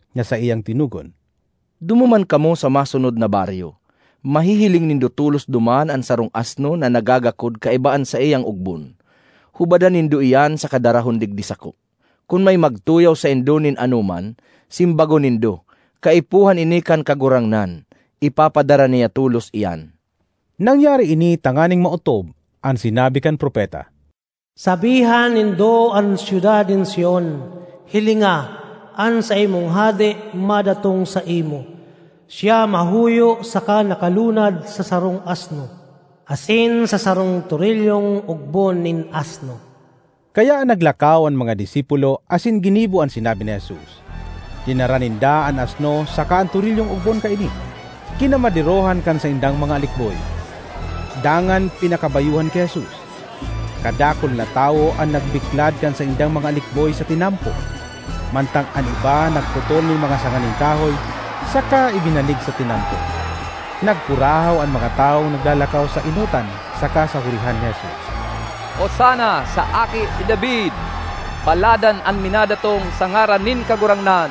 na saiyang tinugon, “Dumuman kamo sa masunod na baryo. Mahihiling nindo tolos duman an sarong asno na nagagakod kaiba an saiyang ogbon. Hubadan nindo iyan saka darahon digdi sako. Kun may magtuyaw saindo nin anoman, simbagon nindo, ‘Kaipuhan ini kan Kagurangnan’; ipapadara niya tolos iyan.” Nangyari ini tanganing maotob an sinabi kan propeta: ”Sabihan nindo an syudad nin Sion, Hilinga, an saimong hade madatong saimo. Siya mahuyo saka nakalunad sa sarong asno, asin sa sarong torilyong ogbon nin asno.” Kaya naglakaw an mga disipulo asin ginibo an sinabi ni Jesus. Dinara ninda an asno saka an torilyong ogbon kaini, kinamaderohan kan saindang mga alikboy, dangan pinakabayohan ki Jesus. Kadakul na tawo an nagbiklad kan saindang mga alikboy sa tinampo, mantang an iba nagputol nin mga sanga nin kahoy saka ibinanig sa tinampo. Nagkurahaw an mga tawong naglalakaw sa enotan saka sa hurihan ni Jesus, “Osana sa Aki ni David! Paladan an minadatong sa ngaran nin Kagurangnan!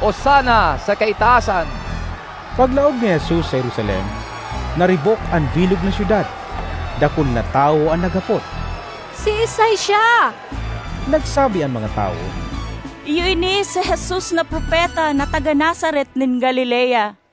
Osana sa kaitaasan!” Paglaog ni Jesus sa Jerusalem, naribok an bilog na syudad. Dakul na tawo an naghapot, “Siisay siya?” Nagsabi an mga tawo, “Iyo ini si Jesus na propeta na taga Nazaret nin Galilea.”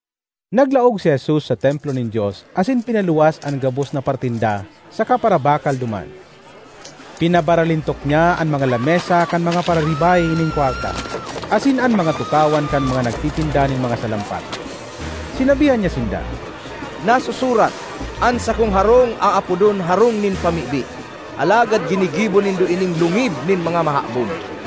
Naglaog si Jesus sa Templo nin Dios asin pinaluwas an gabos na paratinda saka parabakal duman. Pinabaralintok niya an mga lamesa kan mga pararibay nin kwarta asin an mga tukawan kan mga nagtitinda nin mga salampati. Sinabihan niya sinda, “Nasusurat, ‘An sakong harong aapodon harong nin pamibi.’ Alagad ginigibo nindo ining lungib nin mga mahabon!”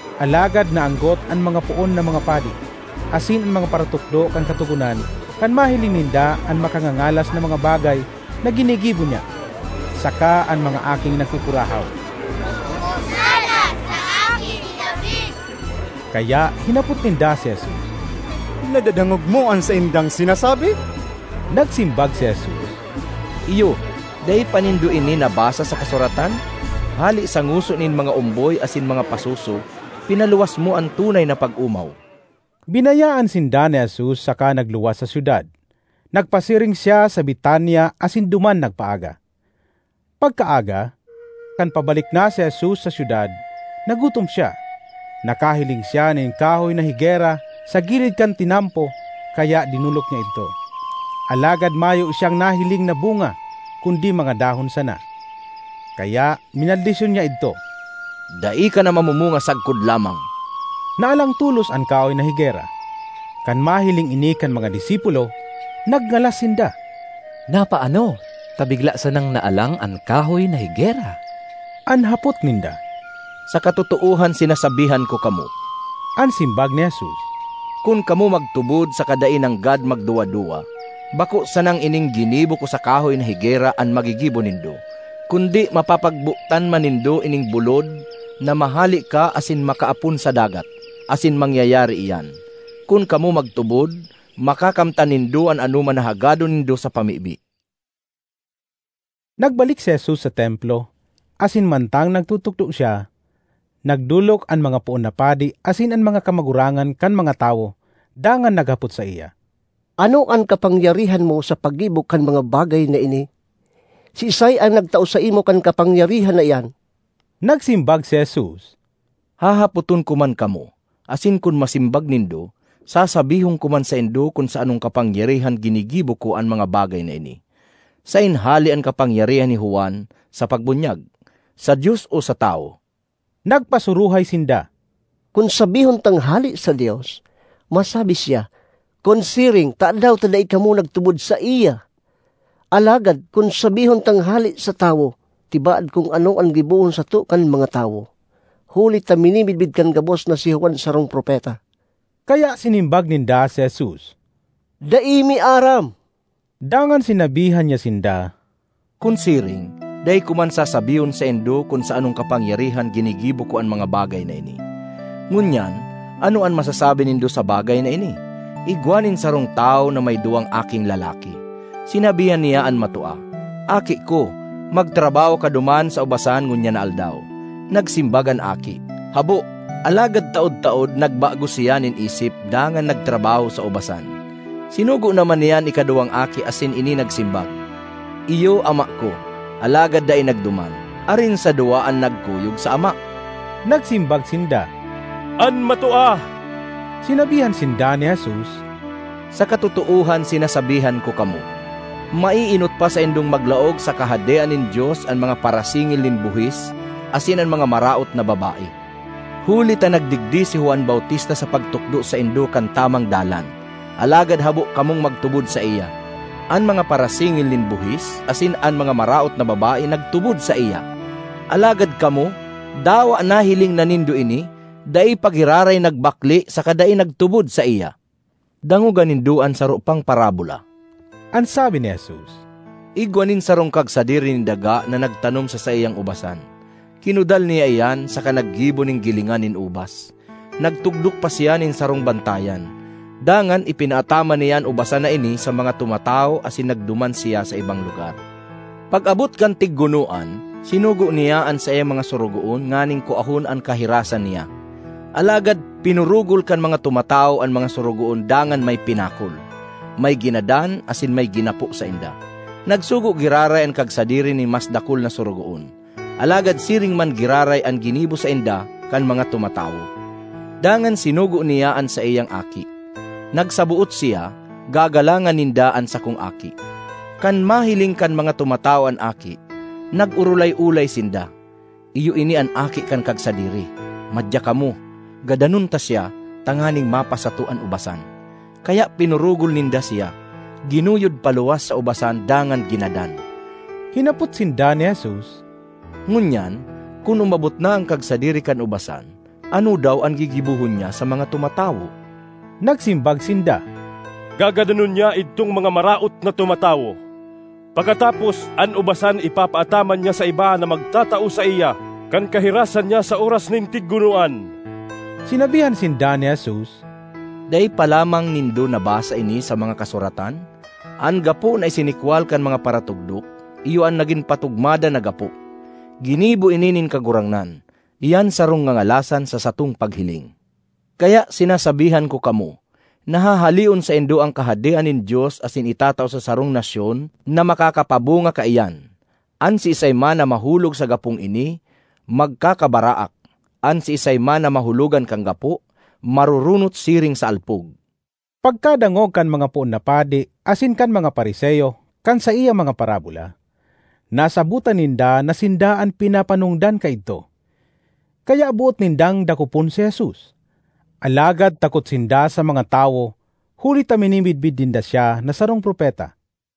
Alagad naanggot an mga poon na mga padi asin an mga paratukdo kan Katogonan kan mahiling ninda an makangangalas na mga bagay na ginigibo niya, saka an mga aking nagkukurahaw, “Osana sa Aki ni David!” Kaya hinapot ninda si Jesus, “Nadadangog mo an saindang sinasabi?” Nagsimbag si Jesus, “Iyo. Dai pa nindo ini nabasa sa kasuratan? ‘Hale sa ngoso nin mga omboy asin mga pasoso, pinaluwas mo an tunay na pag-omaw.’” Binayaan sinda ni Jesus saka nagluwas sa syudad. Nagpasiring siya sa Betania asin duman nagpaaga. Pagkaaga, kan pabalik na si Jesus sa syudad, nagutom siya. Nakahiling siya nin kahoy na higera sa gilid kan tinampo kaya dinolok niya idto. Alagad mayo siyang nahiling na bunga kundi mga dahon sana. Kaya minaldisyon niya idto, “Dai ka na mamumunga sagkod lamang!” Naalang tolos an kahoy na higera. Kan mahiling ini kan mga disipulo, nagngalas sinda, “Napaano ta bigla sanang naalang an kahoy na higera?” an hapot ninda. ”Sa katotoohan sinasabihan ko kamo,” an simbag ni Jesus. “Kun kamo magtubod saka dai nanggad magduwa-duwa, bako sanang ining ginibo ko sa kahoy na higera an magigibo nindo, kundi mapapagbotan man nindo ining bulod na ‘mahale ka asin makaapon sa dagat,’ asin mangyayari iyan. Kun kamo magtubod, makakamtan nindo an anoman na hagadon nindo sa pamibi.” Nagbalik si Jesus sa Templo, asin mantang nagtutukdo siya, nagdolok an mga poon na padi asin an mga kamagurangan kan mga tawo dangan naghapot saiya, “Ano an kapangyarihan mo sa paggibo kan mga bagay na ini? Siisay an nagtao saimo kan kapangyarihan na iyan?” Nagsimbag si Jesus, “Hahapoton ko man kamo, asin kun masimbag nindo, sasabihon ko man saindo kun sa anong kapangyarihan ginigibo ko an mga bagay na ini. Saen hale an kapangyarihan ni Juan sa pagbunyag: sa Dios o sa tawo?” Nagpasuruhay sinda, “Kun sabihon tang hale sa Dios, masabi siya, ‘Kun siring, tadaw ta dai kamo nagtubod saiya?’ Alagad kun sabihon tang hale sa tawo, tibaad kun ano an gibohon sato kan mga tawo, huli ta minimidbid kan gabos na si Juan sarong propeta.” Kaya sinimbag ninda si Jesus, “Dai mi aram.” Dangan sinabihan niya sinda, “Kun siring, dai ko man sasabihon saindo kun sa anong kapangyarihan ginigibo ko an mga bagay na ini. ”Ngunyan, ano an masasabi nindo sa bagay na ini? Igwa nin sarong tawo na may duwang aking lalaki. Sinabihan niya an matua, ‘Aki ko, magtrabaho ka duman sa ubasan ngunyan na aldaw.’ Nagsimbag an aki, ‘Habo,’ alagad taod-taod nagbago siya nin isip dangan nagtrabaho sa ubasan. Sinugo naman niya an ikaduwang aki asin ini nagsimbag, ‘Iyo, ama ko,’ alagad dai nagduman. Arin sa duwa an nagkuyog sa ama?” Nagsimbag sinda, “An matua.” Sinabihan sinda ni Jesus, “Sa katotoohan sinasabihan ko kamo, maeenot pa saindong maglaog sa Kahadean nin Dios an mga parasingil nin buhis asin an mga maraot na babae. Huli ta nagdigdi si Juan Bautista sa pagtukdo saindo kan tamang dalan, alagad habo kamong magtubod saiya. An mga parasingil nin buhis asin an mga maraot na babae nagtubod saiya. Alagad kamo, dawa nahiling na nindo ini, dai pa giraray nagbakle saka dai nagtubod saiya.” ”Dangoga nindo an saro pang parabola,” an sabi ni Jesus. “Igwa nin sarong kagsadiri nin daga na nagtanom sa saiyang ubasan; kinudal niya iyan, saka naggibo nin gilingan nin ubas. Nagtugdok pa siya nin sarong bantayan. Dangan ipinaataman niya an ubasan na ini sa mga tumatawo asin nagduman siya sa ibang lugar. Pag-abot kan tiggunoan, sinugo niya an saiyang mga sorogoon nganing kuahon an kahirasan niya. Alagad pinurugol kan mga tumatawo an mga sorogoon dangan may pinakol, may ginadan asin may ginapo sainda. Nagsugo giraray an kagsadiri nin mas dakul na sorogoon, alagad siring man giraray an ginibo sainda kan mga tumatawo. Dangan sinugo niya an saiyang aki. Nagsaboot siya, ‘Gagalangan ninda an sakong aki.’ Kan mahiling kan mga tumatawo an aki, nag-orolay-olay sinda, ‘Iyo ini an aki kan kagsadiri; madya kamo, gadanon ta siya, tanganing mapasato an ubasan!’ Kaya pinurugol ninda siya, ginuyod paluwas sa ubasan dangan ginadan.” Hinapot sinda ni Jesus, “Ngunyan, kun umabot na an kagsadiri kan ubasan, ano daw an gigibohon niya sa mga tumatawo?” Nagsimbag sinda, “Gagadanon niya idtong mga maraot na tumatawo. Pakatapos, an ubasan ipapaataman niya sa iba na magtatao saiya kan kahirasan niya sa oras nin tiggunoan.” Sinabihan sinda ni Jesus, “Dai pa lamang nindo nabasa ini sa mga Kasuratan? ‘An gapo na isinikwal kan mga paratugdok, iyo an nagin patugmadan na gapo. Ginibo ini nin Kagurangnan; iyan sarong ngangalasan sa satong paghiling!’ Kaya sinasabihan ko kamo na hahaleon saindo an Kahadean nin Dios asin itatao sa sarong nasyon na makakapabunga kaiyan. (An siisay man na mahulog sa gapong ini magkakabaraak; an siisay man na mahulogan kan gapo, maroronot siring sa alpog.”) Pagkadangog kan mga poon na padi asin kan mga Fariseo kan saiyang mga parabola, nasabotan ninda na sinda an pinapanongdan kaidto, kaya boot nindang dakopon si Jesus, alagad takot sinda sa mga (tawo)huli ta minimidbid ninda siya na sarong propeta.